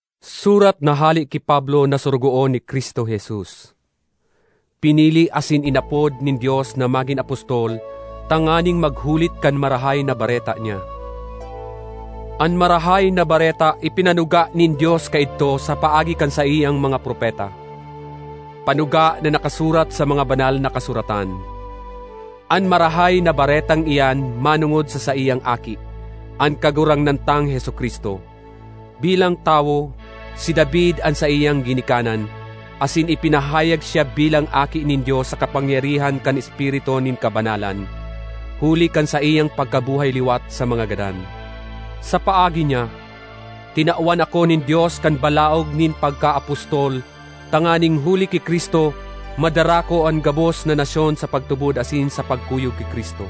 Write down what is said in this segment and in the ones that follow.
Surat na hale ki Pablo na sorogoon ni Cristo Jesus, pinili asin inapod nin Dios na magin apostol tanganing maghulit kan Marahay na Bareta niya. An Marahay na Bareta ipinanuga nin Dios kaidto sa paagi kan saiyang mga propeta, panuga na nakasurat sa mga Banal na Kasuratan. An Marahay na Baretang iyan manongod sa saiyang Aki, an Kagurangnan tang Jesu-Cristo. Bilang tawo, si David an saiyang ginikanan asin ipinahayag siya bilang Aki nin Dios sa kapangyarihan kan Espiritu nin kabanalan, huli kan saiyang pagkabuhay liwat sa mga gadan. Sa paagi niya, tinawan ako nin Dios kan balaog nin pagkaapostol tanganing huli ki Cristo madara ko an gabos na nasyon sa pagtubod asin sa pagkuyog ki Cristo.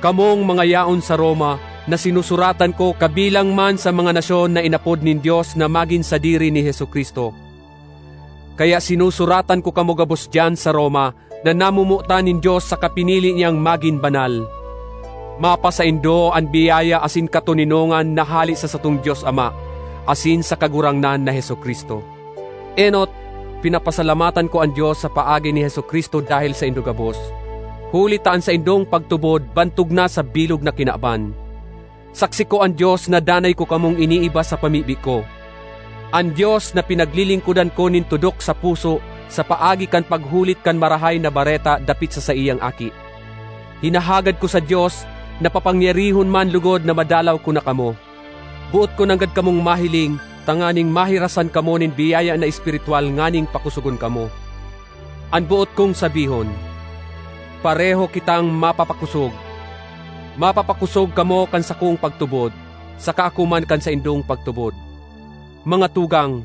Kamong mga yaon sa Roma na sinusuratan ko kabilang man sa mga nasyon na inapod nin Dios na magin sadiri ni Jesu-Cristo. Kaya sinusuratan ko kamo gabos diyan sa Roma na namomotan nin Dios saka pinili niyang magin banal: Mapasaindo an biyaya asin katoninongan na hale sa satong Dios Ama asin sa Kagurangnan na Jesu-Cristo. Enot, pinapasalamatan ko an Dios sa paagi ni Jesu-Cristo dahel saindo gabos, huli ta an saindong pagtubod bantog na sa bilog na kinaban. Saksi ko an Dios na danay ko kamong iniiba sa pamibi ko—an Dios na pinaglilingkodan ko nin tudok sa puso sa paagi kan paghulit kan Marahay na Bareta dapit sa saiyang Aki. Hinahagad ko sa Dios na papangyarihon man logod na madalaw ko na kamo. Boot ko nanggad kamong mahiling tanganing mahirasan kamo nin biyaya na espirituwal nganing pakosogon kamo. An boot kong sabihon, pareho kitang mapapakosog; mapapakosog kamo kan sakong pagtubod, saka ako man kan saindong pagtubod. Mga tugang,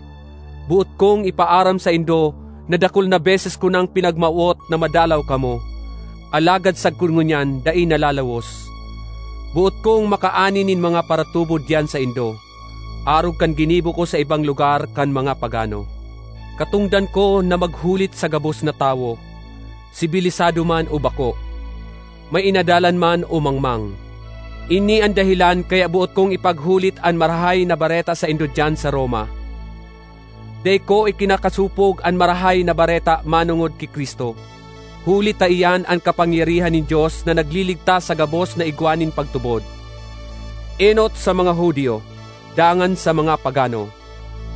boot kong ipaaram saindo na dakul na beses ko nang pinagmawot na madalaw kamo, alagad sagkod ngunyan dai nalalawos. Boot kong makaani nin mga paratubod diyan saindo, arog kan ginibo ko sa ibang lugar kan mga pagano. Katongdan ko na maghulit sa gabos na tawo, sibilisado man o bako, may inadalan man o mangmang. Ini an dahelan kaya boot kong ipaghulit an Marahay na Bareta saindo diyan sa Roma. Dai ko ikinakasopog an Marahay na Bareta manongod ki Cristo, huli ta iyan an kapangyarihan nin Dios na nagliligtas sa gabos na igwa nin pagtubod, enot sa mga Judio, dangan sa mga pagano.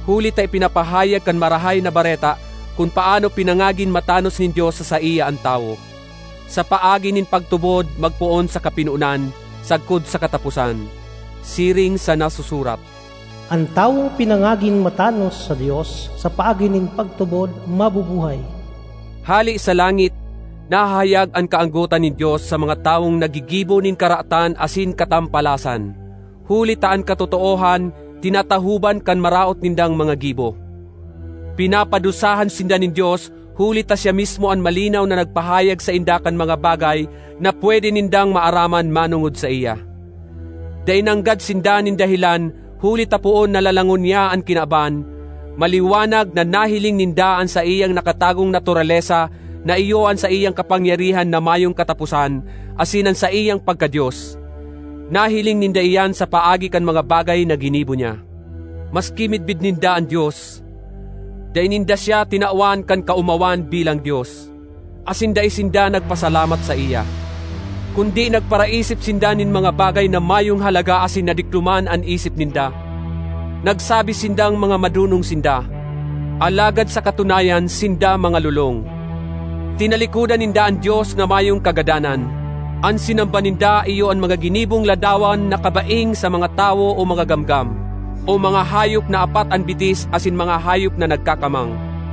Huli ta ipinapahayag kan Marahay na Bareta kun paano pinangagin matanos nin Dios sa saiya an tawo: sa paagi nin pagtubod magpoon sa kapinonan sagkod sa kataposan. Siring sa nasusurat, “An tawong pinangagin matanos sa Dios sa paagi nin pagtubod, mabubuhay.” Hale sa langit nahahayag an kaanggotan nin Dios sa mga tawong naggigibo nin karatan asin katampalasan, huli ta an katotoohan tinatahoban kan maraot nindang mga gibo. Pinapadusahan sinda nin Dios huli ta siya mismo an malinaw na nagpahayag sainda kan mga bagay na pwede nindang maaraman manongod saiya. Dai nanggad sinda nin dahelan huli ta poon na lalangon niya an kinaban, maliwanag na nahiling ninda an saiyang nakatagong naturalesa na iyo an saiyang kapangyarihan na mayong kataposan asin an saiyang pagka-Dios. Nahiling ninda iyan sa paagi kan mga bagay na ginibo niya. Maski midbid ninda an Dios, dai ninda siya tinawan kan kaomawan bilang Dios, asin dai sinda nagpasalamat saiya. Kundi nagparaisip sinda nin mga bagay na mayong halaga asin nadikloman an isip ninda. Nagsabi sindang mga madonong sinda, alagad sa katunayan sinda mga lolong. Tinalikodan ninda an Dios na mayong kagadanan; an sinamba ninda iyo an mga ginibong ladawan na kabaing sa mga tawo o mga gamgam o mga hayop na apat an bitis asin mga hayop na nagkakamang.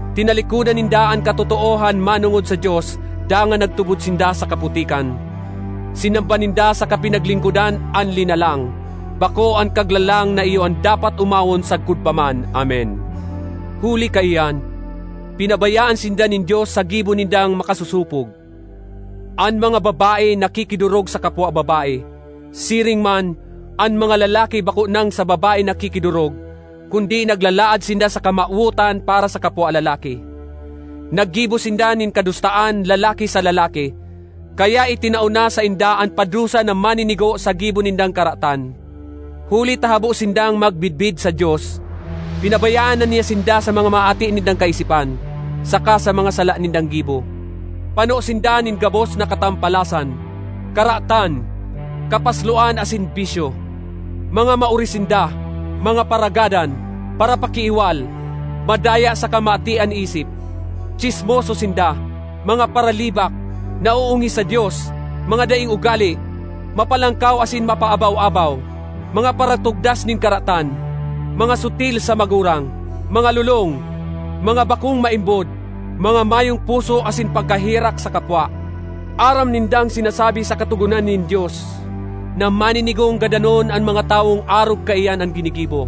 Tinalikodan ninda an katotoohan manongod sa Dios dangan nagtubod sinda sa kaputikan. Sinamba ninda saka pinaglingkodan an linalang, bako an Kaglalang na iyo an dapat omawon sagkod pa man! Amen. Huli kaiyan, pinabayaan sinda nin Dios sa gibo nindang makasosopog. An mga babae nakikidorog sa kapwa babae. Siring man, an mga lalaki bako nang sa babae nakikidorog, kundi naglalaad sinda sa kamawotan para sa kapwa lalaki. Naggibo sinda nin kadustaan lalaki sa lalaki, kaya itinao na sainda an padusa na maninigo sa gibo nindang karatan. Huli ta habo sindang magmidbid sa Dios, pinabayaan na niya sinda sa mga maaati nindang kaisipan, saka sa mga sala nindang gibo. Pano sinda nin gabos na katampalasan, karatan, kapasloan asin bisyo. Mga maori sinda, mga paragadan, parapakiiwal, madaya saka maati an isip. Tsismoso sinda, mga paralibak, naoongis sa Dios, mga daing ugale, mapalangkaw asin mapaabaw-abaw; mga paratogdas nin karatan, mga sutil sa magurang; mga lolong, mga bakong maimbod, mga mayong puso asin pagkaherak sa kapwa. Aram nindang sinasabi sa katogonan nin Dios na maninigong gadanon an mga tawong arog kaiyan an ginigibo,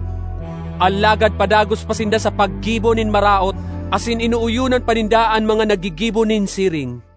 alagad padagos pa sinda sa paggibo nin maraot asin inooyonan pa ninda an mga naggigibo nin siring.